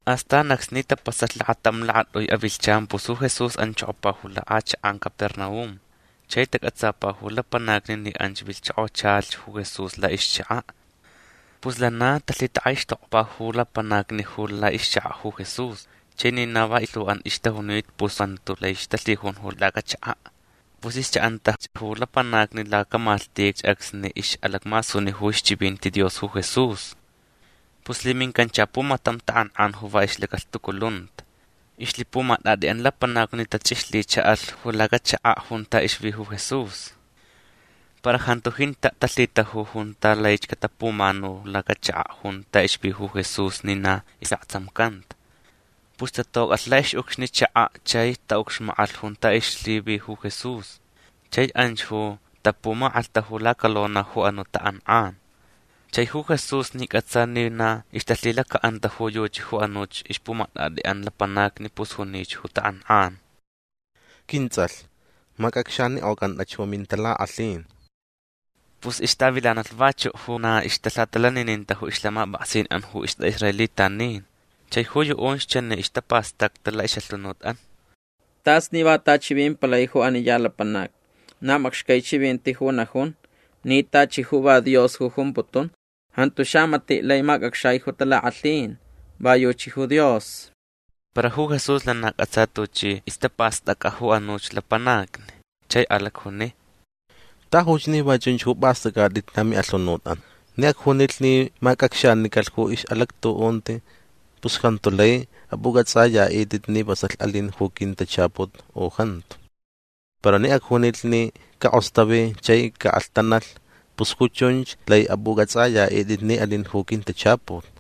Astan acsni tapasalh lakatam lakatʼui avilhchan pus ju Jesús anchokopa ju lakʼachakʼan Capernaum. Chai tacʼatsapa ju lapanacni ni anch vilhchokochalhch ju Jesús laʼixchakaʼ. Pus lana talhitakʼaixtokpa ju lapanacni ju laʼixchakaʼ ju Jesús. Chai ni na va ilhuʼan ixtajunita pus jantuch lai ixtalhijun ju lacachakaʼ. Pus ixchaʼantach ju lapanacni lacamalhtich acsni ixʼalacmasuni ju ixchivinti Dios ju Jesús. Pus lhimincancha pumatam takʼankʼan ju va ixlacalhtuculunta. Ixlhipumatʼatʼiʼan lapanacni tachʼixlhichaʼalh ju lacachakaʼ junta ixvi ju Jesús. Para jantu jintaʼ talhitaju junta laich catapumanu lacachakaʼ junta ixvi ju Jesús ni na isʼaktsamcanta. Pus tatocʼalh laʼixʼucxni chakaʼ chai taʼucxmakʼalh junta ixlhivi ju Jesús. Chai anch ju tapumakʼalhtaju lacalona ju anuʼ takʼankʼan. Chai ju Jesús ni cʼatsa ni na ixtalhilacaʼanta ju yuchi ju anuch ixpumatʼatʼiʼan lapanacni pus junich ju takʼankʼan: ―Quintsʼalh macʼacxanikʼocantach ju mintalakʼalhin. Pus ixtavilanalh vachuʼ ju na ixtalhatalanininta ju ixlhamapʼaksinʼan ju istʼaʼisraelitanin. Chai ju yuʼunch chani istapastacta laʼixʼalhunutʼan: “Tas ni va ta chivimpalai ju ani ya lapanac. Na macxcai chivinti ju najun ni tachi ju va Dios ju jumputun. Jantu xamatiʼ lai macʼacxai ju talakʼalhin. Va yuchi ju Dios”. Para ju Jesús lana cʼatsa tuchi istapastʼacʼa ju anuch lapanacni. Chai alacjuni: ―Tajuch ni va chunch ju pʼastʼacʼatʼit lamiʼalhunutʼan. Ni acjunilh ni macʼacxanicalh ju ixʼalactuʼunti pus jantu lai apʼucʼatsʼayaʼitʼit ni vasalh alin ju quintachaput u jantu. Para ni acjunilh ni cakʼostavi chai caʼalhtanalh pus ju chunch lai apʼucʼatsʼayaʼitʼit ni alin ju quintachaput.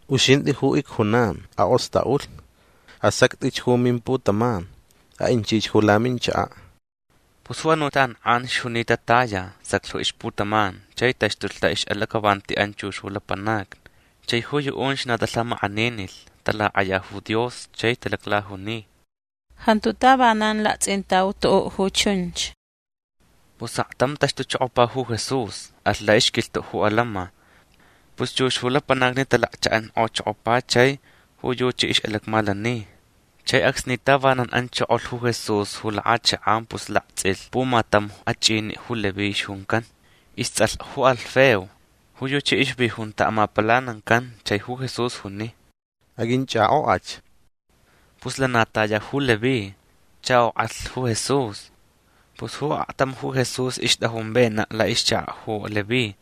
―Uxintʼi ju icjunan. Akʼostʼaʼulh. Asactʼich ju mimputaman. Aʼinchich ju laminchakaʼ. Pus ju anuʼ takʼankʼan ixjunita taya. Saclh ju ixputaman. Chai taxtulh laʼixʼalacʼavantiʼan chux ju lapanacni. Chai ju yuʼunch na talhamakʼaninilh. Talakʼaya ju Dios. Chai talaclajuni: ―Jantu tavanan laktsʼintau tuʼuʼ ju chunch. Pus aktam taxtuchokopa ju Jesús. Alh laʼixquilhtuʼ ju atantsʼin. Pus chux ju lapanacni talakchaʼankʼochokopa chai ju yuchi ixʼalacmalani. Chai acsni tavanan anchokolh ju Jesús ju lakʼachakʼan pus laktsʼilh pumatam achʼiniʼ ju Leví ixjuncan. Istsʼalh ju Alfeo. Ju yuchi ixvi junta amapalanancan. Chai ju Jesús juni: ―Aqʼuinchʼakʼokʼach. Pus lana taya ju Leví. Chʼakʼokʼalh ju Jesús. Pus ju aktam ju Jesús ixtʼajun venaʼ laʼixchakaʼ ju Leví.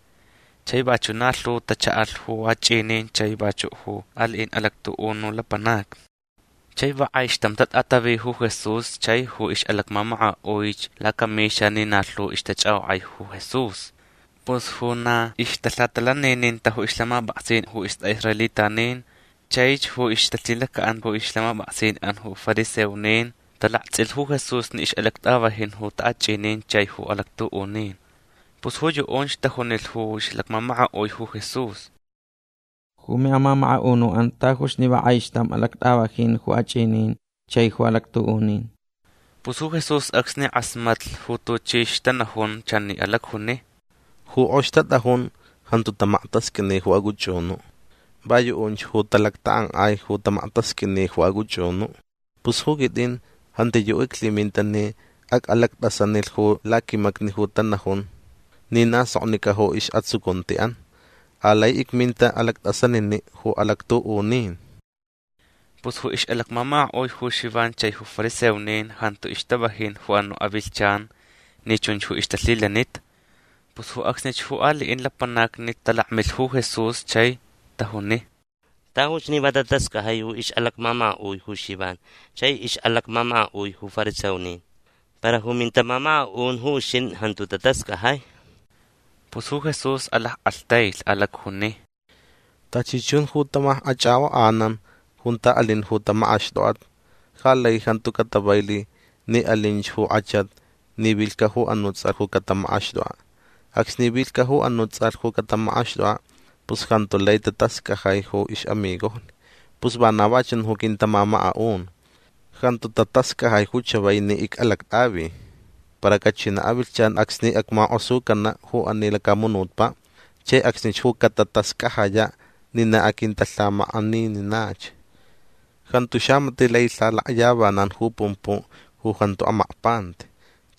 Chai vachuʼ na lhu tachaʼalh ju achʼinin chai vachuʼ ju aliʼin alactuʼunu lapanacni. Chai va kʼaixtam tatʼatavi ju Jesús chai ju ixʼalacmamakaʼuich lacamixa ni na lhu ixtachʼakʼokʼai ju Jesús. Pus ju na ixtalhatalaninintach ju ixlhamapʼaksin ju istʼaʼisraelitanin chaich ju ixtalhilacaʼan ju ixlhamapʼaksinʼan ju fariseonin talaktsʼilh ju Jesús ni ixʼalactʼavajin ju taʼachʼinin chai ju alactuʼunin. Pus ju yuʼunch tajunilh ju ixʼalacmamakaʼui ju Jesús: ―Ju miʼamamakaʼunuʼan tajuch ni va kʼaixtam alactʼavajin ju achʼinin chai ju alactuʼunin. Pus ju Jesús acsni kʼasmatlh ju tuchi ixtanajun chani alacjuni: ―Ju kʼox tatʼajun jantu tamaktasqʼuini ju acʼuchʼunuʼ. Va yuʼunch ju talactakʼankʼai ju tamaktasqʼuini ju acʼuchʼunuʼ. Pus ju quitʼin jantiyuʼ iclhiminta ni acʼalactʼasanilh ju laquimacni ju tanajun ni na soknicʼa ju isʼatsucuntiʼan. Alai icminta alactʼasaniniʼ ju alactuʼunin. Pus ju ixʼalacmamakaʼui ju Xivan chai ju fariseonin jantu ixtavajin ju anuʼ avilhchan ni chunch ju ixtalhilanita. Pus ju acsnich ju aliʼin lapanacni talakmilh ju Jesús chai tajuni: ―Tajuch ni va tatascajai ju ixʼalacmamakaʼui ju Xivan chai ixʼalacmamakaʼui ju fariseonin. Para ju mintamamakaʼun ju uxintʼi jantu tatascajai. Pus ju Jesús alackʼalhtailh. Alacjuni: ―Tachi chun ju tamakʼachʼakʼokʼanan junta alin ju tamakʼaxtʼokʼat ja lai jantu catavailh ni alinch ju kʼachat ni vilhcaʼ ju anuʼ tsʼalh ju catamakʼaxtʼokʼaʼ. Acsni vilhcaʼ ju anuʼ tsʼalh ju catamakʼaxtʼokʼaʼ pus jantu lai tatascajai ju ixʼamigojni. Pus vana va chun ju quintamamakaʼun. Jantu tatascajai ju chavai ni icʼalactʼavi. Para cachinaʼ avilhchan acsni acmakʼosucanaʼ ju ani lacamunutpaʼ. Chai acsnich ju catatascajayaʼ ni na aquintalhamakʼanininach. Jantu xamatiʼ lai lhalakyavanan ju pumpuʼ ju jantu amakpanti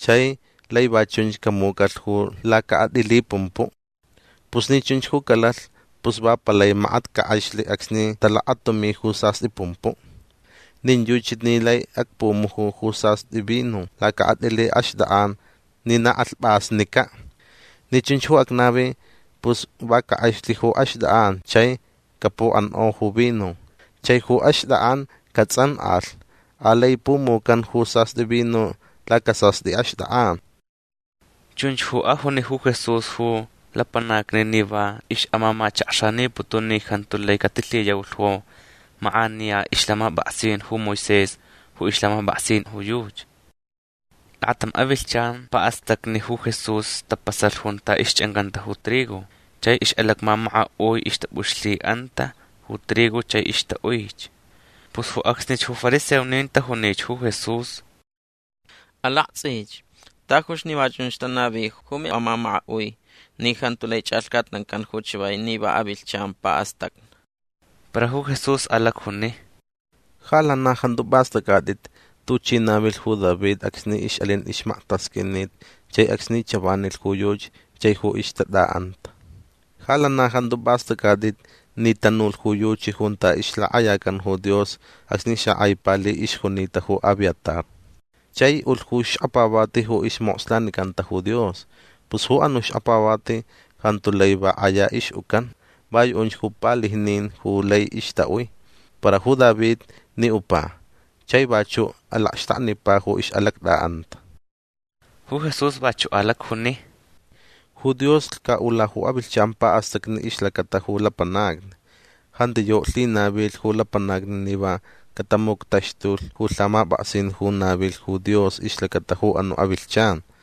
chai lai va chunch camucʼalh ju lacakʼatʼili pumpuʼ. Pus ni chunch ju calalh pus va palai makat cakʼexlh acsni talakatumi ju sastʼi pumpuʼ. Nin yuchi ni lai acpumuju ju sastʼi vino lacakʼatʼili axtʼakʼan ni na kʼalhpʼasnicaʼ. Ni chunch ju acnavi pus va cakʼexlh ju axtʼakʼan chai capuʼankʼo ju vino chai ju axtʼakʼan catsʼankʼalh. Alai pumucan ju sastʼi vino lacasastʼi axtʼakʼan. Chunch ju ajuni ju Jesús ju lapanacni ni va ixʼamamachakxaniputun ni jantu lai catilhiyaulh ju makʼaniya ixlhamapʼaksin ju Moisés ju ixlhamapʼaksin ju yuchi. Lakatam avilhchan paʼastacni ju Jesús tapasalh junta ixchʼancanta ju trigo. Chai ixʼalacmamakaʼui ixtapʼuxlhiʼanta ju trigo chai ixtaʼuich. Pus ju acsnich ju fariseonin tajunich ju Jesús: ―Alaktsʼich. Tajuch ni va chunch tanavi ju miʼamamakaʼui ni jantu lai chʼalhcatnancan ju chavai ni avilhchan paʼastacni. Para ju Jesús alacjuni: ―Ja lana jantu pʼastʼacʼatʼit tuchi navilh ju David acsni ixʼalin ixmaktasqʼuinit chai acsni chavanilh ju yuchi chai ju ixtatʼaʼanta. Ja lana jantu pʼastʼacʼatʼit ni tanulh ju yuchi junta ixlakʼayacan ju Dios acsni xakʼai pali ixjunita ju Abiatar. Chai ulh ju xkapavati ju ismokslanicanta ju Dios. Pus ju anuʼ xkapavati jantu lai va kʼaya ixʼucan. Va yuʼunch ju palijnin ju lai ixtaʼui. Para ju David ni upa chai vachuʼ alacxtaknipa ju ixʼalactʼaʼanta. Ju Jesús vachuʼ alacjuni: ―Ju Dios lhcaʼula ju avilhchan paʼastacni ixlacata ju lapanacni. Jantiyuʼ lhinavilh ju lapanacni ni va catamuctaxtulh ju lhamapʼaksin ju navilh ju Dios ixlacata ju anuʼ avilhchan.